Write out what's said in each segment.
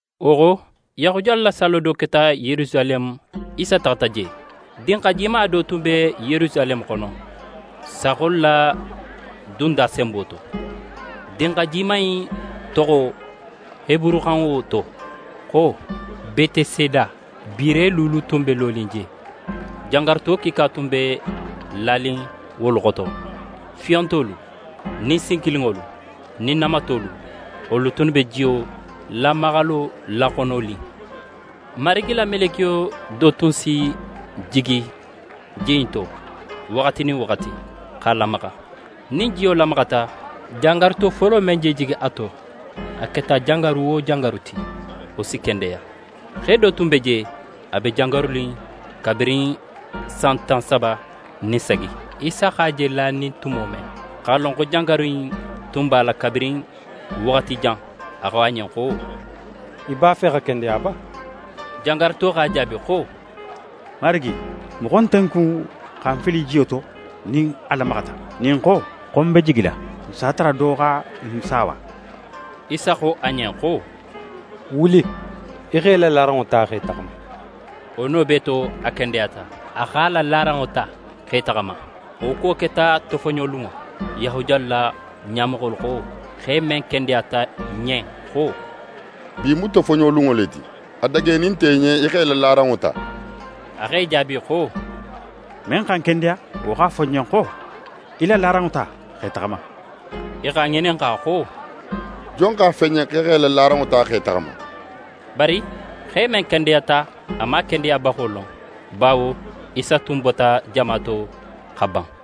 Wo xo, Yahudiyalu la sallo do keta Yerusaleme. Isa taxata je. Dinxa jima do tun be Yerusaleme xono, Saaxolu la Dunda senbo to. Dinxa jima in toxo heburuxanŋo to xo: Beteseda. Biire luulu tun be lonin je. Jangaruto kiika tun be lanin wolu xoto: Fiyontolu nin sinkilinŋolu nin namatolu. [Wolu tunnu be jiyo lamaxalo laxononin. Marigi la melekiyo do tun si jigi ji in to waxati nin waxati, x'a lamaxa. Nin jiyo lamaxata, jangaruto folo men je jigi a to, a keta jangaru wo jangaru ti, wo si kendeya.] Xe do tun be je, a be jangarunin kabirin san tan saba nin sagi. Isa x'a je lanin tumo men, x'a lon xo jangaru in tun b'a la kabirin waxati jan, a xo a ɲen xo: «Í b'a fe xa kendeya ba?» Jangaruto x'a jaabi xo: «Marigi, moxo nte ń kun xa ń fili jiyo to nin a lamaxata. Nin ń xo, xo ń be jigila, ń s'a tara do xa ń saawa.» Isa xo a ɲen xo: «Wuli, í x'é la laranŋo ta, x'é taxama.» Wo no bee to, a kendeyata. A x'a la laranŋo ta, x'é taxama. Wo kuwo keta tofoɲolunŋo. Yahudiyalu la ɲamoxolu xo xe men kendeyata ɲen xo: «Bi mu tofoɲolunŋo le ti. A dagenin nte í ɲen í x'é la laranŋo ta.» A x'e jaabi xo: «Men xa ń kendeya, wo x'a fo ń ɲen xo: Í la laranŋo ta, x'é taxama.» I x'a ŋininxa xo: «Jon x'a fo í ɲen xo í x'é la laranŋo ta, x'é taxama?» Bari xe men kendeyata, a man a kendeyabaxo lon, bawo Isa tun bota jama to xa ban.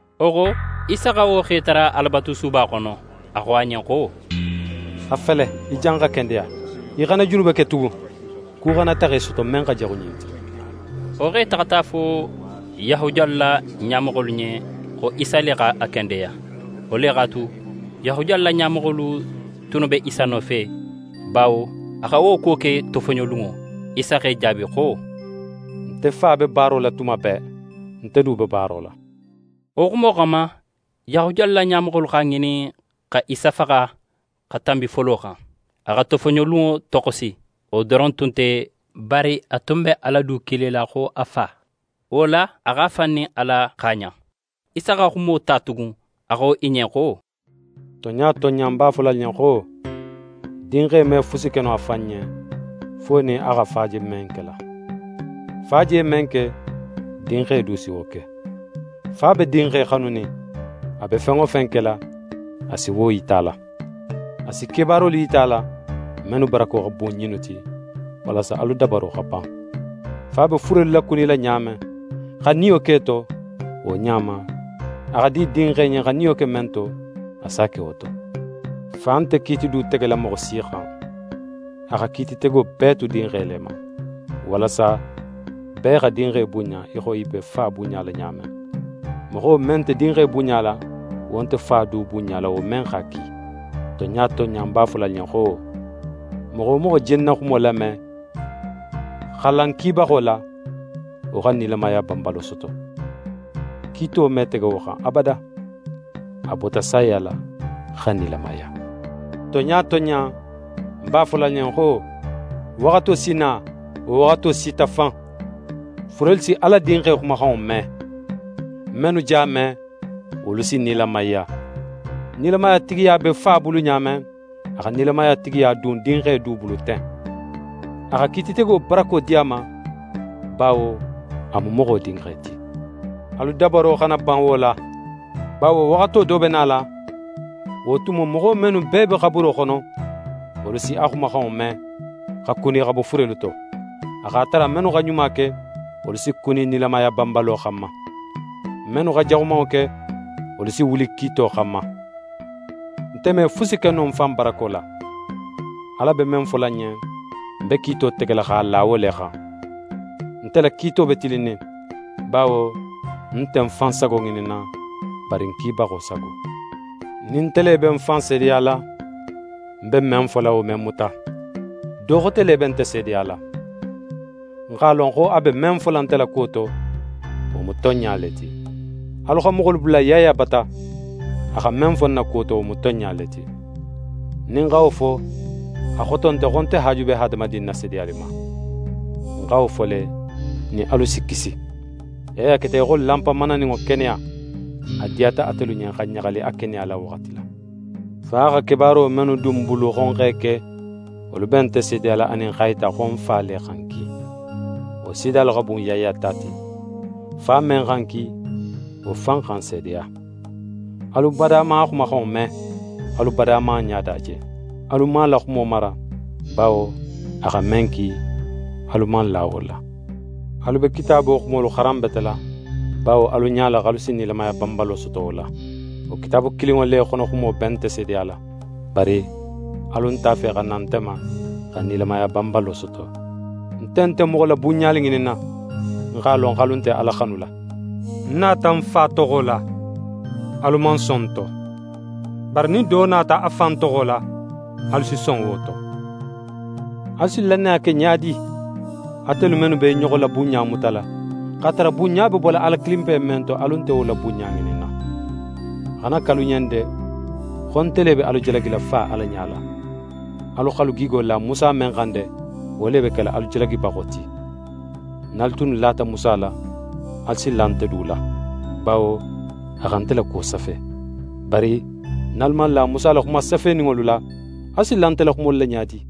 Wo xo, Isa xa wo xe tara Alabatusuba xono. A xo a ɲen xo: «A fele, í janxa kendeya. Í xana junube ke tugun, ku xana taxa í soto, men xa jaxu ɲin ti.» Wo xe taxata a fo Yahudiyalu la ɲamoxolu ɲen xo Isa le x'a kendeya. Wo le x'a tu, Yahudiyalu la ɲamoxolu tunnu be Isa nofe, bawo a xa wo kuwo ke tofoɲolunŋo. Isa x'e jaabi xo: «Nte Fa be baaro la tuma bee. Nte du be baaro la.» Wo xumo xanma, Yahudiyalu la ɲamoxolu x'a ŋinin xa Isa faxa xa tanbi folo xan. A xa tofoɲolunŋo toxosi. Wo doron tun nte, bari a tun be Ala du kilila xo a Fa. Wo la, a x'a fan nin Ala xaaɲan. Isa xa xumo ta tugun, a xo i ɲen xo: «Tonɲa tonɲa, ń b'a fola alu ɲen xo: Dinxe me fusi ke no a fan ɲen, fo nin a xa Fa je men kela. Fa je men ke, Dinxe du si wo ke. Fa be Dinxe xanunin, a be fen wo fen kela, a si wo yita a la. A si kebaarolu yita a la, mennu barako xa bun ɲinnu ti, walasa alu dabaro xa ban. Fa be furelu lakunila ɲa men, xa niyo k'e to, wo ɲa ma, a xa di Dinxe ɲen xa niyo ke men to, a s'a ke wo to. Fa nte kiiti du tegela moxo si xan. A xa kiititego bee tu Dinxe le ma, walasa bee xa Dinxe bunɲa í xo i be Fa bunɲala ɲa men. Moxo men nte Dinxe bunɲala, wo nte Fa du bunɲala, wo men x'a ki. «Tonɲa tonɲa, ń b'a fola alu ɲen xo: Moxo wo moxo je ń na xumo lame, xa la ń kibaxo la, wo xa nilamaya banbalo soto. Kiito me tege wo xan abada. A bota saya la, xa nilamaya. Tonɲa tonɲa, ń b'a fola alu ɲen xo: Waxato si na, wo waxato sita fan, furelu si Ala Dinxe xumaxanŋo me. Mennu j'a me, wolu si nilamaya. Nilamaya tigiya be Fa bulu ɲa men, a xa nilamaya tigiya dun Dinxe du bulu ten. A xa kiititego barako di a ma, bawo a mu Moxo Dinxe ti. Alu dabaro xana ban wo la, bawo waxato do be nala; wo tumo moxo, mennu bee be xaburo xono, wolu si a xumaxanŋo me, xa kuni xa bo furelu to. A x'a tara mennu xa ɲuma ke, wolu si kuni nilamaya banbalo xanma. Mennu xa jaxumanŋo ke, wolu si wuli kiito xanma. «Nte me fusi ke no ń fan barako la. Ala be men fola ń ɲen, ń be kiito tegela x'a la wo le xan. Nte la kiito be tilinnin, bawo ń nte ń fan sago ŋininna, bari ń kibaxo sago. Nin nte le be ń fan seedeyala, ń be men fola, wo me muta. Do xote le be nte seedeyala. Ń x'a lon xo a be men fola nte la kuwo to, wo mu tonɲa le ti. Alu xa moxolu bula Yaya bata, a xa men fo ń na kuwo to, wo mu tonɲa le ti. Nin ń xa wo fo, a xoto nte xo nte haaju be hadamadin na seedeyali ma. Ń xa wo fo le, nin alu si kisi. Yaya keta í xo lanpa mananinŋo keneya. A diyata atelu ɲen xa ɲaxali a keneya la waxati la. Fa xa kebaaro mennu dun ń bulu xo ń x'e ke, wolu be nte seedeyala anin x'a yita xo Fa le xa ń ki. Wo seedeyalu xa bun Yaya ta ti. Fa men xa ń ki, wo fan xa ń seedeya. Alu bada man a xumaxanŋo me. Alu bada man a ɲada je. Alu man a la xumo mara, bawo a xa men ki, alu man la wo la. Alu be Kitaabo xumolu xaranbetela, bawo alu ɲala, x'alu si nilamaya banbalo soto wo la. Wo Kitaabu kilinŋo le xonoxumo be nte seedeyala. Bari alu nt'a fe xa na nte ma, xa nilamaya banbalo soto. «Nte nte moxo la bunɲali ŋininna. Ń x'a lon xo alu nte Ala xanula. Ń nata ń Fa toxo la, alu man son ń to. Bari nin do nata a fan toxo la, alu si son wo to. Alu si lannaya ke ɲa di, atelu mennu be i ɲoxo la bunɲa mutala, x'a tara bunɲa be bola Ala kilinpe men to, alu nte wo la bunɲa ŋininna? A xana ke alu ɲen de xo nte le be alu jalagila Fa Ala ɲala. Alu x'alu gigo la Musa men xan de, wo le be kela alu jalagibaxo ti. Nin alu tunnu lata Musa la, alu si la nte du la, bawo a xa nte la kuwo safe. Bari nin alu man la Musa la xuma safeninŋolu la, alu si la nte la xumolu la ɲa di?»